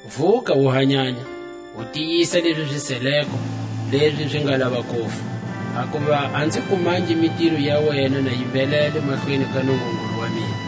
Vuka u hanyanya, u tiyisa lezi zi seleko, lezi zi nga lava kufa; hakuva a nzi kumangi mitiro ya wena na yi mbhelele mahlweni ka Nungungulu wa mina.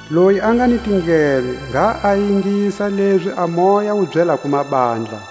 Loyi a nga ni tindleve, ngha a ingisa lezi a Moya wu byelako mabandla.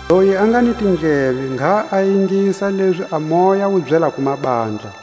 i oyi a nga ni tindleve, ngha a ingisa lezi a Moya wu byelako mabandla.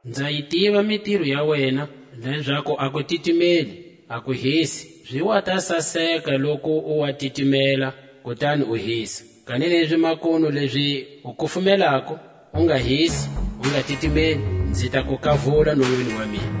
Nza yi tiva mitiro ya wena, lezaku a ku titimeli, a ku hisi; zi wa ta saseka loku u wa titimela, kutani u hisa. Kanilezi makunu lezi u kulumelako, u nga hisi, u nga titimeli, nzi ta ku kavula nonwini wa mina.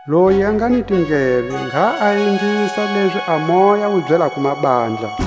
Loyi a nga ni tindleve, ngha a ingisa lezi a Moya wu byelako mabandla.